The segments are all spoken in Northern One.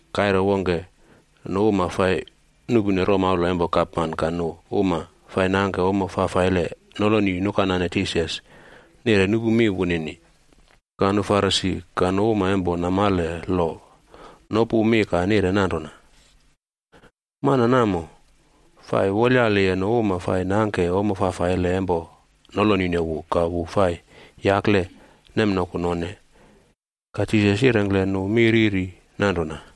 Kaire wongke nu uma fai nuꞌpune romaula empo gapman ka nu uma fai nangke nale fafaile noloni nukanane Jisas nire nupu mi wunini. Ka nu Farisi ka nu uma empo namale lo nopu mi ka nire nanrona, “Mana namo fai wolyaliye nu uma fai nangke nale fafaile empo nolonine wu ka wu fai yakle nemnoku none.” Ka Jisas yirengkle nu mi riri nanrona: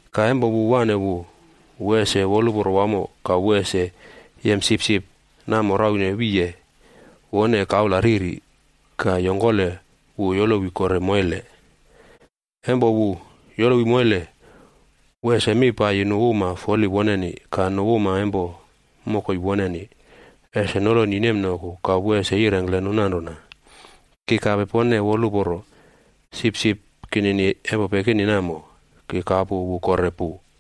Ka empo wu waꞌne wu, wu ese woluporo wamo ka wu ese yem sipsip namo raune wiye wone kaula riri ka yongkole wu yolowi kore moile. Empo wu yolowi moile, wu ese mi paiyi nu uma foli woneni ka nu uma empo mokoi woneni ese noloni nemnoku ka wu ese yirengkle nu nanrona, ‘Ki kape pone woluporo, sipsip kinini empo pekini namo, ki kapu wu kore pu.’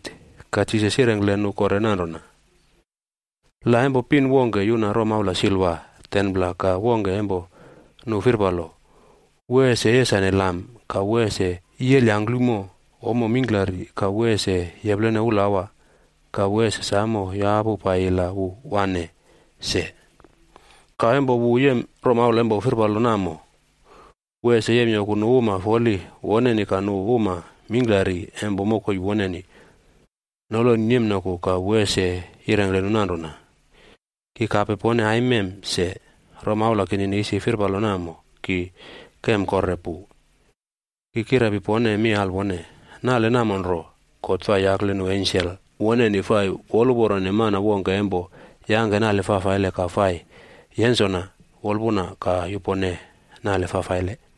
Ka Jisas yirengkle nu kore nanrona, “La empo pin wongke yuna romaula silva 10pla ka wongke empo nu firpalo. Wu ese yesane lam ka wu ese yiyel yangklumo ommo mingklari ka wu ese yeplene ulawa ka wu ese samo yapu paiyi la wu waꞌne se. Ka empo wu yem romaula empo firpalo namo, wu ese yemyoku nu uma foli woneni ka nu uma mingklari empo mokoi woneni noloni nemnoku ka wu ese yirengkle nu nanrona, ‘Ki kape pone aimem se, romaula kinini isi firpalo namo, ki kem kore pu.’ Ki kirepi pone mi alwone, nale namo nro, God fai yakle nu ensel woneni fai woluporone mana wongke empo yangke nale fafaile ka fai yensona wolpuna ka yupone nale fafaile.”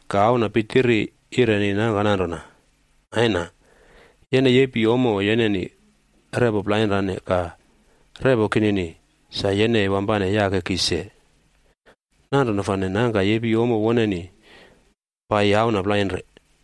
Ka auna pitiri yireni nangka nanrona, ‘Aina, yene yepi ommo yeneni repo plainrane ka repo kinini sa yene wampane yake ki se.’ Nanrona fane nangka yepi ommo woneni paiyi auna plainre.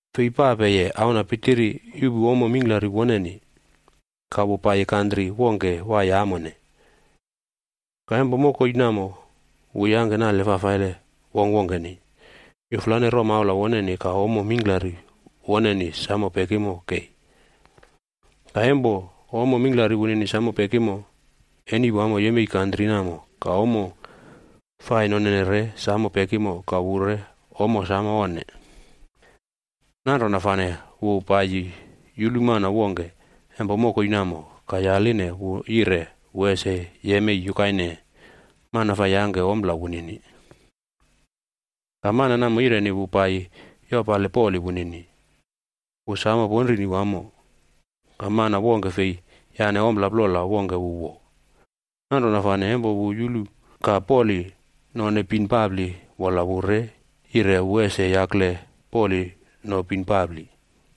“Fei papeye auna pitiri yuꞌpu ommo mingklari woneni, ka wu paiyi kantri wongke waiye amone. Ka empo mokoi namo wu yangke nale fafaile wongkwongkeni yuflane romaula woneni ka ommo mingklari woneni samo pekimo kei. Ka empo ommo mingklari wunini samo pekimo, eni wamo yemei kantri namo ka ommo fai nonene re samo pekimo ka wu re ommo samo onne. Nanrona fane wu paiyi yulu mana wongke empo mokoi namo ka yaline wu yire wu ese yemei yukaine mana fai yangke ompla wunini. Ka mana namo yireni wu paiyi yopale poli wunini. Wu samo ponrini wamo, ka mana wongke fei yane ompla plola wongke wu wo. Nanrona fane empo wu yulu ka poli none bin papli wola wu re yire wu ese yakle poli no bin papli.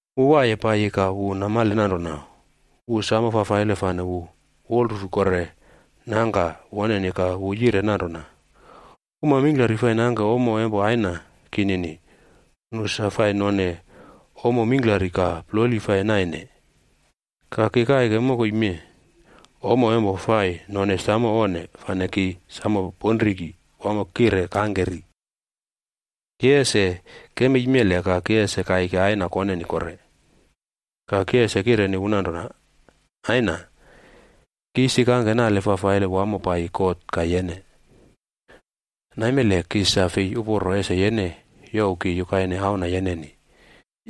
“Wu waiye paiyi ka wu namale nanrona wu samo fafaile fane wu wolrufu kore nangka woneni ka wu yire nanrona, ‘Uma mingklari fai nangke ommo empo aina kinini, nu sa fai none ommo mingklari ka ploli fai naine. Ka ki kaike mokoi mee ommo empo fai none samo onne fane ki samo ponriki wamo kire kangke ri. Ki ese kemei mele ka ki ese kaiki aina koneni kore, ka ki ese kireni wu nanrona, “Aina, ki isi kangke nale fafaile wamo paiyi God ka yene. Naimele ki sa fei uporo ese yene youw ki yukaine auna yeneni.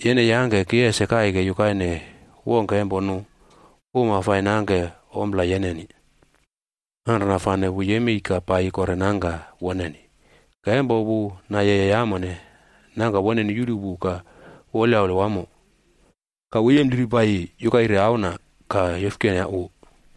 Yene yangke ki ese kaike yukaine wongke empo nu uma fai nangke ompla yeneni.” ’ Nanrona fane wu yemei ka paiyi kore nangka woneni. “Ka empo wu nayeye amone, nangka woneni yulu wu ka wolyaule wamo. Ka wu yempliri paiyi yukaire auna ka yofkene wu.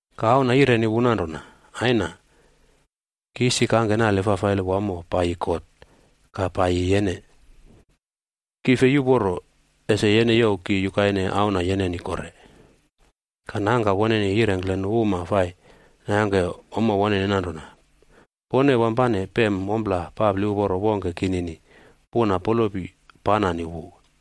“Ka auna yireni wu nanrona, ‘Aina, ki isi kangke nale fafaile wamo paiyi God ka paiyi yene. Ki fei uporo ese yene youw ki yukaine auna yeneni kore.’ “Ka nangka woneni yirengkle nu uma fai nangke ommo woneni nanrona, ‘Pone wampane pem ompla papli uporo wongke kinini puna polopi panani wu.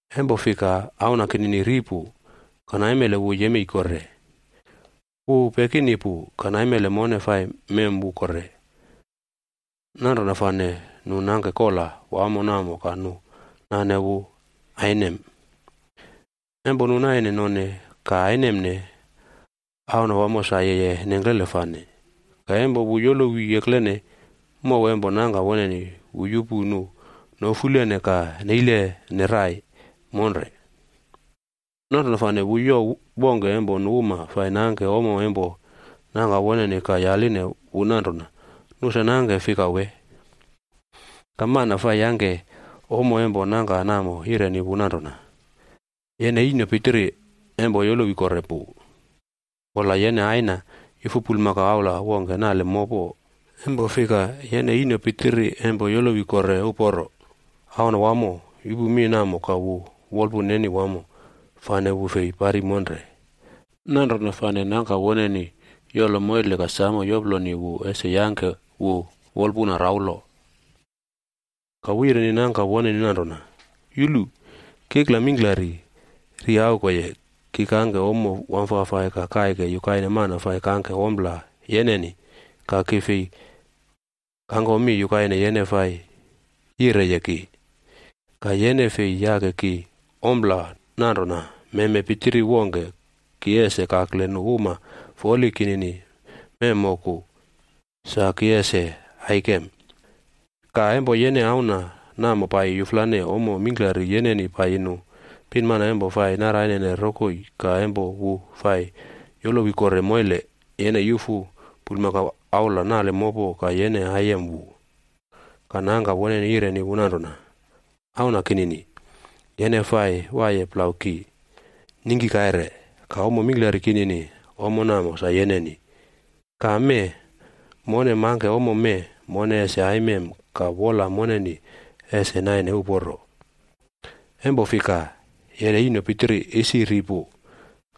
Empo fika auna kinini ri pu, ka naimele wu yemei kore. Wu pekini pu, ka naimele mone fai mem wu kore.’ Nanrona fane nu nangke kola wamo namo ka nu nane wu ainem. “Empo nu naine none ka ainemne, auna wamo sa yeye nengklele fane. Ka empo wu yolowi eklene mow empo nangka woneni, wu yupu nu nofulene ka neilene rai monre. Nanrona fane wu youw wongke empo nu uma fai nangke ommo empo nangka woneni ka yaline wu nanrona nu sa nangke fika wee? Ka mana fai yangke ommo empo nangka namo yireni wu nanrona, ‘Yene ino pitiri empo yolowi kore pu, wola yene aina yufu bulmakau aula wongke nale mopo, empo fika yene ino pitiri empo yolowi kore uporo.’ “Auna wamo yupu mi namo ka wu wolpun neni wamo, fane wu fei pari monre. Nanrona fane nangka woneni yolo moile ka samo yoploni wu ese yangke wu wolpuna raulo. Ka wu yireni nangka woneni nanrona, ‘Yulu! Kikla mingklari riaukoye, ki kangke ommo wamfafai ka kaike yukaine mana fai kangke ompla yeneni ka ki fei kangko mi yukaine yene fai yireye ki. Ka yene fei yake ki ompla nanrona meme pitiri wongke ki ese kakle nu uma foli kinini memmoku sa ki ese aikem. Ka, empo yene auna namo paiyi yuflane ommo mingklari yeneni paiyi nu pinmana empo fai narainene rokoi ka empo wu fai yolowi kore moile, yene yufu bulmakau aula nale mopo ka yene aiyem wu.’ “Ka nangka woneni yireni wu nanrona, ‘Auna kinini, yene fai waiye plau ki ningki kaire, ka ommo mingklari kinini, ommo namo sa yeneni. Ka mee, mone mangke ommo mee mone ese aimem ka wola moneni ese naine uporo, empo fika yene ino pitiri isi ri pu,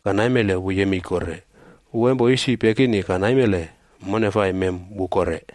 ka naimele wu yemei kore. Wu empo isi pekini ka naimele mone fai mem wu kore.’”